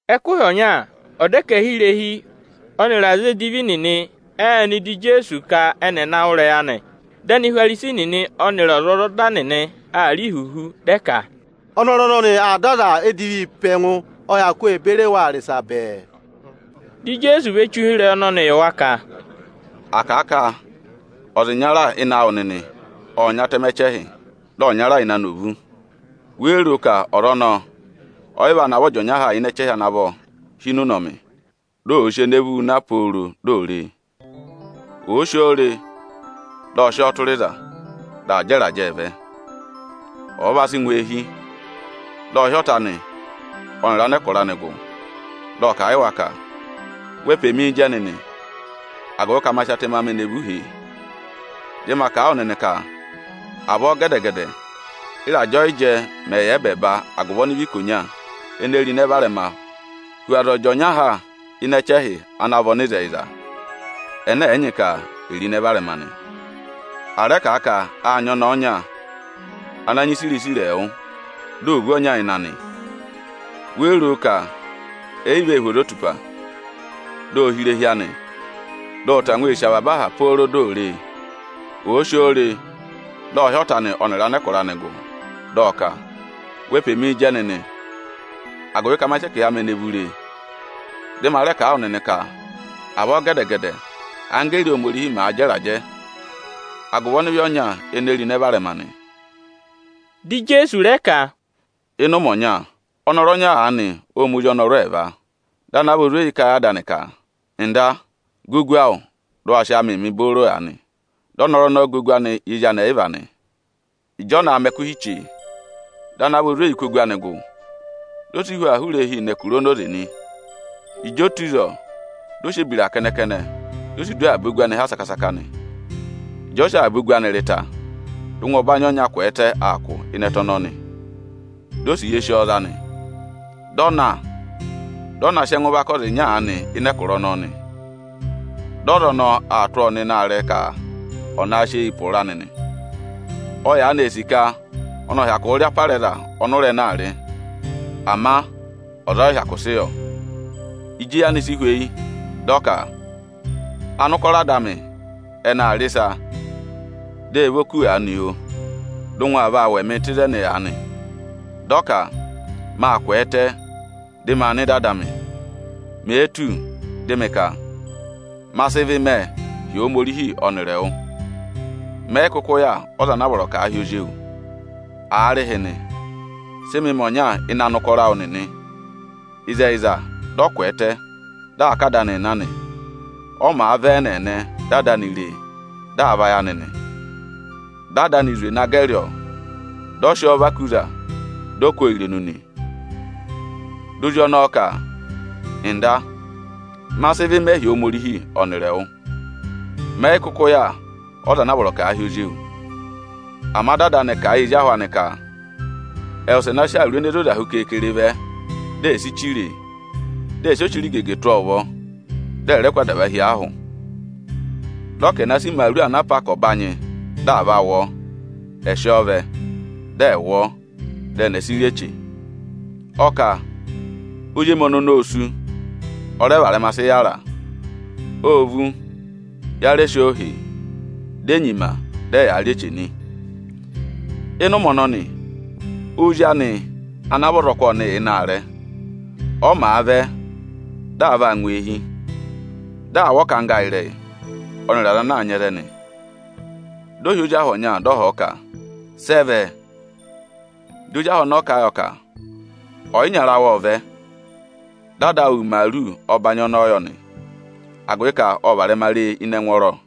Ẹkụhị ọnya, ọdẹkẹhirehi ọnịrị aza edivi nịnị ệ nọ ịdị Ijeesu ka ẹnị ẹ̀ na wụ́ ịrẹyị anị. Dị Anihwarisi nịnị ọnịrị ọzwọzọda nịnị aa rị ihuhu, dị ẹ ka, “Ọnọrụ ọnọnị aa dọ aza edivii pe ẹngụ, ọ hyakụ ee beri waa rị ịsa bẹẹ.” Dị Ijeesu ve che ụhịrẹyị ọnọnị yị wa ka: “À kà a ka ọza ịnyara ịnị awụ nịnị ộ nyị atẹmẹ ẹchẹhị, dị ọnyara ịnị anị ò vú. Wéé ro ka ọza ọnọọ ọ yị vaa navọ ọ jị ọnya ha ịnị ẹchẹhị ana vọ hi ịnị ụnọmị, di òo sì ene vúu na pooro di ò re e? Òo si oo re, dị ọ sị ọọ tụra ịza, dị aa jẹ ịrajẹẹ vẹ. Ọ̀ọ va sị ngụ eehi, dị ọ hị́ ọta anị ọnịrị anẹkụra anị gụ, dị ọ kà a yị wa ka: ‘Wee pe mii jẹ nịnị, agụvị ka ma sị atẹmẹ amị ene vú hèe.’ Dị ma kà a wụ nịnị ka avọọ gẹdẹ-gẹdẹ ị́rajẹ ọyịjẹ mẹ̀ yà ẹbẹẹba agụvị ọnịvị ikonya ene ro ịnẹ varẹma hu aza ọ jị ọnya ha ịnị ẹchẹhị ana vị ọnịzẹyịza, ẹnẹ ẹ̀ yị nyị ka è ro ịnẹ varẹma nị.” “À rẹ kà a ka â nyị ọnẹẹ ọnya ana nyị ẹkẹhị isiriva ẹẹwụ, di o vú ọnya ịnị anị nị. Wéé ro ka ẹ yị vee hú ozotupa, di o hì irehi anị, dị ọ tangwa ee sì ọọ avaba aha pooro di ò re e? Òo si oo re, dị ọ hị́ ọta anị ọnịrị anẹkụra anị gụ, dị ọ ka: ‘Wee pe mii jẹ nịnị, agụvị ka ma sị ẹkẹhị amị ene vú re!’ Dị ma rẹ kà a wụ nịnị ka avọọ gẹdẹ-gẹdẹ anggẹẹrị Ohomorihi màa jẹ ịrajẹ agụvị ọnịvị ọnya ene ro ịnẹ varẹma nị.” Dị Ijeesu rẹ ka, “Ịnị ụmẹ ọnya, ọnọrụ ọnya aanị ộ ma ozi ọnọrụ ẹẹva. Dị ana vị ozweyi ka ẹ yị ada anị ka: ‘Nda, gà ogu awụ, dị ụ wa sị áamịị mị booro aanị!’ Dị ọnọrụ ọnọọ gà ogu anị yị ezi anị ẹyịva nị. Ịjị ọ na aa mẹ ẹkụhị chee, dị ana vị ozweyi kụ́ ogu anị gụ, di o si hu aa hụrẹ eehi nọ ẹkụra onoze nị. Ịjị o tù ịzọọ, dị ọ sị ebira kẹnẹ-kẹnẹ, di o si du avaba ogu anị ha saka-saka nị. Ịjị ọ sị avaba ogu anị rị ta, dị ụngwẹ ọbanyị ọnya kwẹẹtẹ aa kụ̀ ịnị ẹtẹ ọnọọ nị. Di osiye sị ọọ za nị. Ộ na, dị ọ naa mẹ ụkọrọọ yị anẹkụra ọnọọ ọnya nị. Dị ọza ọnọọ aa tụ́ ọọ sị ịsọyịrị naa yị ụ̀rá anị ịnị aarẹ nị. Ọ yaanị ee sì ka ọnị ọ̀ hyakụụ rị apara ẹza ọnị ụra ẹnẹẹ aa rị, ama ọza ọ yị hyakụ sị yọ. Ịjị eyi anị si hweyi, dị ọ ka: ‘Anụkọrọ ada amị ẹnị aa rị ịsa, dị ẹ vọ kú aanị, oo; dị ụngwẹ aa vaa wụ̀ ẹmịị tụ́ ịzẹnị aanị nị.’ Dị ọ ka: ‘Maa kwẹẹtẹ, dị maa nọ ịdị ada amị. Mèe tù, dị mị ka: Ma sị ịvị mẹ hi Ohomorihi ọnịrị ẹwụ. Mẹ yị kụkụ yà ọza ana a vọrọ ka àa hị́ ozi ewu. Aarịhịnị, sị mị mẹ̀ ọnya ịnị anụkọrọ awụ nịnị!’” “Ịzẹyịza, dị ọ kwẹẹtẹ, dị aa ká ada anịị na nị. Ọ màa vẹ ẹ́nẹẹnẹ, dị ada anị re e, dị aa vayị anị nị. Dị ada anị zwe na gẹrị ọ, dị ọ hàrà a ku ayị nị. Di ozi ọnọọ ka: ‘Nda, ma sị ịvị mẹ hi Ohomorihi ọnịrị ẹwụ. Mẹ yị kụkụ yà ọza ana a vọrọ ka àa hị́ ozi ewu.’ Ama dị ada anị kà a yị ezi ahụ anị ka ẹ̀ wụsẹ na sị awuru ene zoza hu keekere vẹ, di è si chire e, dị ẹ̀ sị ochirigege tụ́ ọọ ụvọ, dị ẹ̀ rẹ kụ́ adava hi ọọ ahụ nị! Dị ọ ka ẹ̀ na sị imaaru ana a pá ka ọ̀ banyị di à va wụ ọọ; ẹ̀ sị ọọ vẹ, dị ẹ̀ wụ ọọ, dị ẹnị ẹ̀ sị rị eche nị! Ọ kà, ‘Ozi emi ọnọnị ô sú, ọ rẹ varẹma sị yàra; ô vú, ya rẹ sị ọ hèe.’ Di e nyima, dị ẹyaa rị eche nị: “Ịnị ụmẹ ọnọnị, ozi anị ana vị ọzọkụ ọnị yà ịnị aarẹ. Ọ màa vẹ, di aa vaa ngụ eehi, di aa wụ́ aahẹ ịrẹyị ọnịrị aza maa nyị ẹzẹ nị. Ộ hị́ ozi ahụ ọnya, dị ọ họ̀ ọ ka: ‘Sị ẹ vẹ?’ Dị ozi ahụ ọnọọ kà a yọ ka: ‘Ọyịnyara awụ ộ vẹ, dị ada awụ wụ imaaru ọbanyị ọnọọ yọ nị, agụvị ka ộ varẹma re e ịnị ẹngwọọrọ.’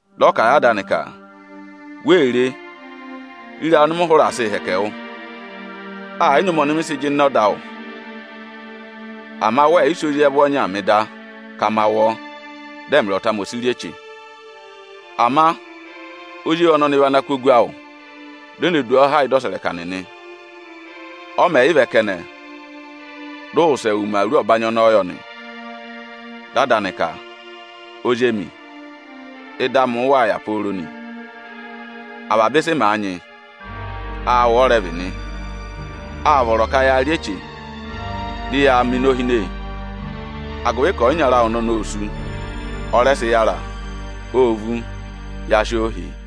Dị ọ kà a yị ada anị ka: ‘Wee re! Re ịrayị ọnị mị hụrẹ aa sịị hẹkẹ wụ! Ẹ yị nyị ụmẹ ọnị mị sị jịnẹ ọda awụ da. Ama wẹẹ̀ yị sị ozi ẹvụ ọnyaa mị da, ka ma wụ ọ, dị ẹmịrị ọta amị ẹ̀ sị rị eche. Ama ozi ewu ọnọnị vị ana kụ́ ogu awụ, di o ne du ọọ ha ị́dị ọsẹrẹka nịnị. Ọ mẹ̀ yị vẹ kẹnẹ, dị ụ wụsẹ wụ imaaru ọbanyị ọnọọ yọ nị.’ Dị ada anị ka: ‘Ozi emi, ị́dị amị ụụ̄ yà pooro nị; avaba ịsị mị nyị, vị áawụ. Â vọrọ ka yaa rị eche, dị yaa mẹ inohine, agụvị ka ọyịnyara awụ ọnọnị ô sú, ọ rẹ sị yara; ô vú, ya sị ọọ hèe.’”